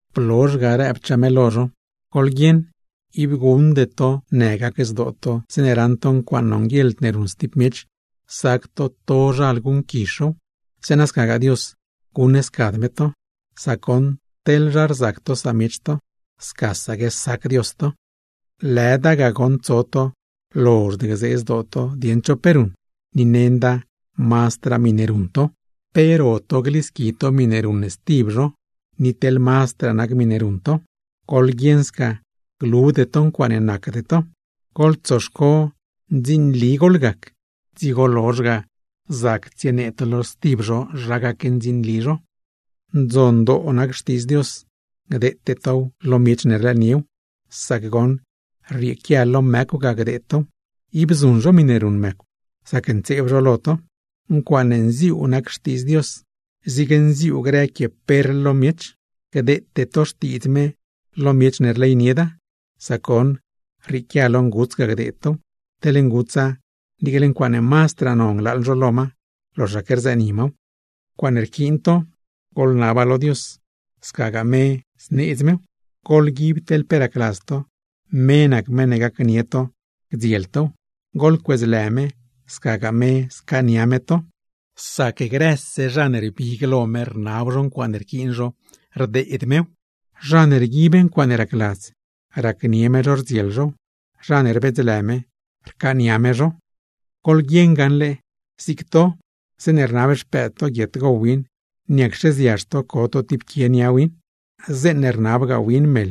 Blozh ga rëbchaa me lo zho: ―Goḻguieṉ, ib guṉde to në gac zdoo to zeeṉe raṉ to ncuaaṉ nonguieḻd ne ruṉ stib miech, sac to tozhal guṉquizh zhow; zeeṉa scagaa Dios, guṉscad me to. Sac goṉ teḻ zha rzac to samiech to, scasaque sac Dios to. ’¡Lëda ga goṉ tso to lozhd gzee zdoo to dieṉ cho pe ruṉ, ni nenda mazdraa miṉe ruṉ to! ¿Pe ro to glisqui to miṉe ruṉ stib zho, ni teḻ mazdraa nac miṉe ruṉ to? ¡Goḻguieṉ sca glude to ncuaaṉe nacde to! Glo goḻtsoxco ndzinli gac to, dzigo lozh ga zac tsienee to lo stib zho zha gacndzinli zho. ’Ndzon nac Xtiidz Dios, gdeete tow lo zha ne rlëëniew, sac goṉ rrieequia lo mëcw ga gdeed tow, ib zuṉ zho miṉe ruṉ mëcw zacntseeb zho lo to. Naca zig nac quie perl, gdeete tow lo zha ne rleynieda, sac goṉ rrieequia lo nguts ga gdeed tow, teḻ ngutsa niicle ncuaaṉe mazdraa non glaaḻ zho lo ma, loxaque gzëëni maw. ’Ncuaaṉe rquiin to, goḻnaba lo Dios, scagaa me zneedz mew. Goḻguib teḻ pe racladz to, me nac meṉ ne gacnie to gdziel tow. Goḻcuedzlë me, scagaa me scaania me to. Sac grëse zha ne rbig lo me rnab zho ncuaaṉe rquiin zho, rdeed mew. Zha ne rguib ncuaaṉe racladz, racnie me zho rdziel zhow. Zha ne rbedzlë me, rcaania me zho. ’Goḻwi gaṉle, zig nac to zeeṉe rnab xpëëd to guiet gow win, ¿niacxe ziazh to co to tib quie nia win? Zeeṉe rnabgaa win meḻ,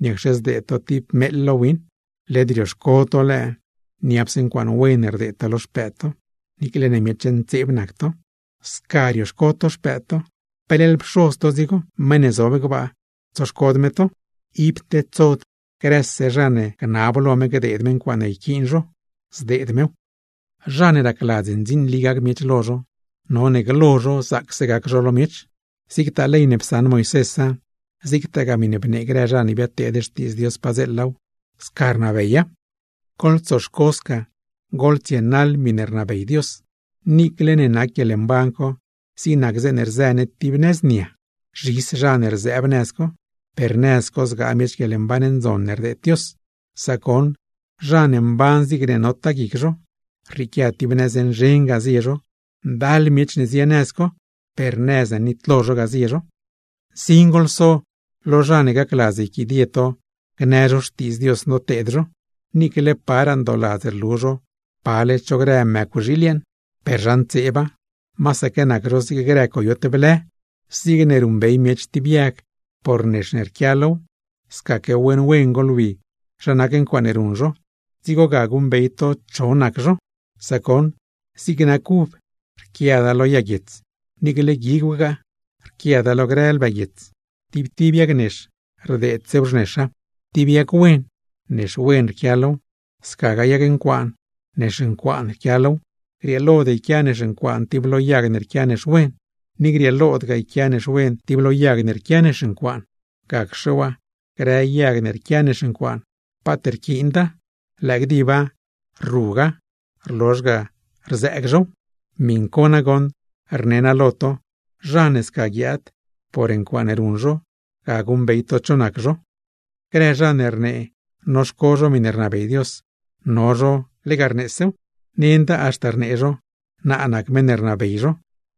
¿niacxe zdeed to tib meeḻ lo win? Led rioxco to lëë niapse ncuaaṉe wen rdeed to lo xpëëd to, niicle ne miech ntseeb nac to. Teḻne sca rioxco to xpëëd to, peleḻ Pxoz to dzigo, meṉ ne zob gbaa, tsoxcod me to. Ib tedsod grëse zha ne gnab lo me gdeed me ncuaaṉe rquiin zho, zdeed mew. ’Zha ne racladz ndzinli gac miech lo zho, none glo zho zaacse gac zho lo miech. Zigtaa ley ne psaṉ Moisésa, zigtagaa miṉe bnee grë zha ne biadteed xtiidz Dios padzeelaw, sca rnabeya. ’Goḻtsoxco sca tsienaḻ to miṉe rnabey Dios, niicle ne nac guieḻmban co zig nac zeeṉe rzë ne tib nëz nia. Zhis zha ne rzëëb nëz co, per nëz co zgaa miech guieḻmban ndzon ne rdeed Dios. Sac goṉ zha ne mban zigne notaa guic zho, rrieequia tib nëz nzhen ga zie zho; ndal miech ne zie nëz co, per nëz ne nitlo zho ga zie zho. ’Nsin goḻso lo zha ne gacladz yquidie to gnë zho xtiidz Dios noteed zho, niicle ndooladz rlu zho pale cho grë mëcwxiil yeeṉ, per zha ntseeba, masaque nac zho zig grë coyot blë. Zigne ruṉbey miech tib yag por nex ne rquia low, scaque wen wen goḻwi zha nac ncuaaṉe ruṉ zho, dzigo ga guṉbey to cho nac zho. Sac goṉ zig nac uv, rquiada lo yag guiets; niicle guigwgaaw rquiada lo grë lbë guiets. Tib tib yag nex rdeedsew xnexa. Tib yag wen, nex wen rquia low; scagaa yag ncuaana, nex ncuaan rquia low. Grieelod yquia nex ncuaan tib lo yag ne rquia nex wen, ni grieelodgaa yquia nex wen tib lo yag ncuaan. Gacxe waa grë yag ne rquia nex ncuaan, paat rquiinda, lëë gdib rruga, rlozh ga rzëëg zhow. Miṉ co nagoṉ rne naa lo to, zha ne sca guiaad, por ncuaaṉe ruṉ zho ga guṉbey to cho nac zho. ’Grë zha ne rnee noxco zho miṉe rnabey Dios, no zho lega rneesew. Nenda haxta rnee zho, naa nac meṉ ne rnabey zho,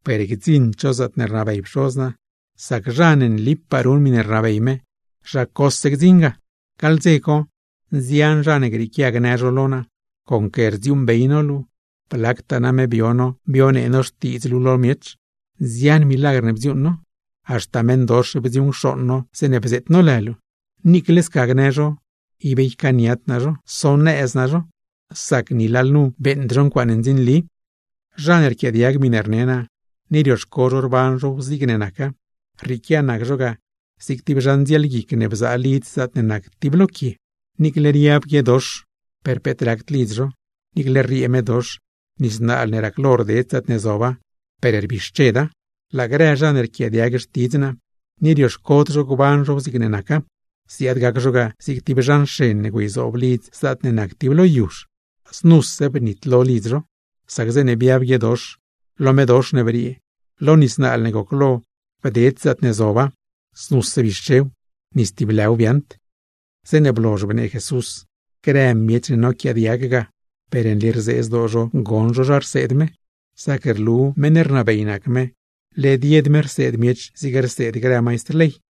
per gdziṉd zho zaatne rnabey Pxoz naa. Sac zha ne nlipaa ruṉ miṉe rnabey me, zha cose gdziṉ ga. Gaḻ dze co, nzian zha ne grieequia gnë lo naa: “Conque rdziuuṉbey no luu, blactaa name bio no bionee no Xtiidz luu lo miech, nzian milagr ne bdziuuṉ no, haxta meṉdox bdziuṉcxooṉ no zeeṉe bzeet no lë luu.” Niicle sca gnë zho, ib ycaaniad naa zho, sonëz naa zho; sac ni lalnu beeṉd zho ncuaaṉe ndzinli. ’Zha ne rquiaadiag miṉe rne naa, ni rioxco zho rban zhow zigne naca, rrieequia nac zho ga zig tib zha ndzielguic ne bzaa lidz zaatne nac tib lo quie. Niicle riab guiedox per peet racd lidz zho, niicle rriee medox, nis naal ne raclo rded zaatne zoba ga, per rbixcheda. ’Laa grë zha ne rquiaadiag xtidz naa, ni rioxcod zho gban zhow zigne naca, ziaad gac zho ga zig tib zha nxen ne güeyzoob lidz zaatne nac tib lo yuzh. Znuse bnitlo lidz zho, sac zeeṉe biab guiedox, lo medox ne briee, lo nis naal ne goclo bded zaatne zoba, znuse bixchew, ni stib lëw biaaṉd. Zeeṉe blozh bnee Jesús, grë miech ne noquiaadiag ga, per nli rzee zdoo zho goṉ zho zha rseed me, sac rlu meṉ rnabey nac me, led yed me rseed miech zig rseed grë maistr ley.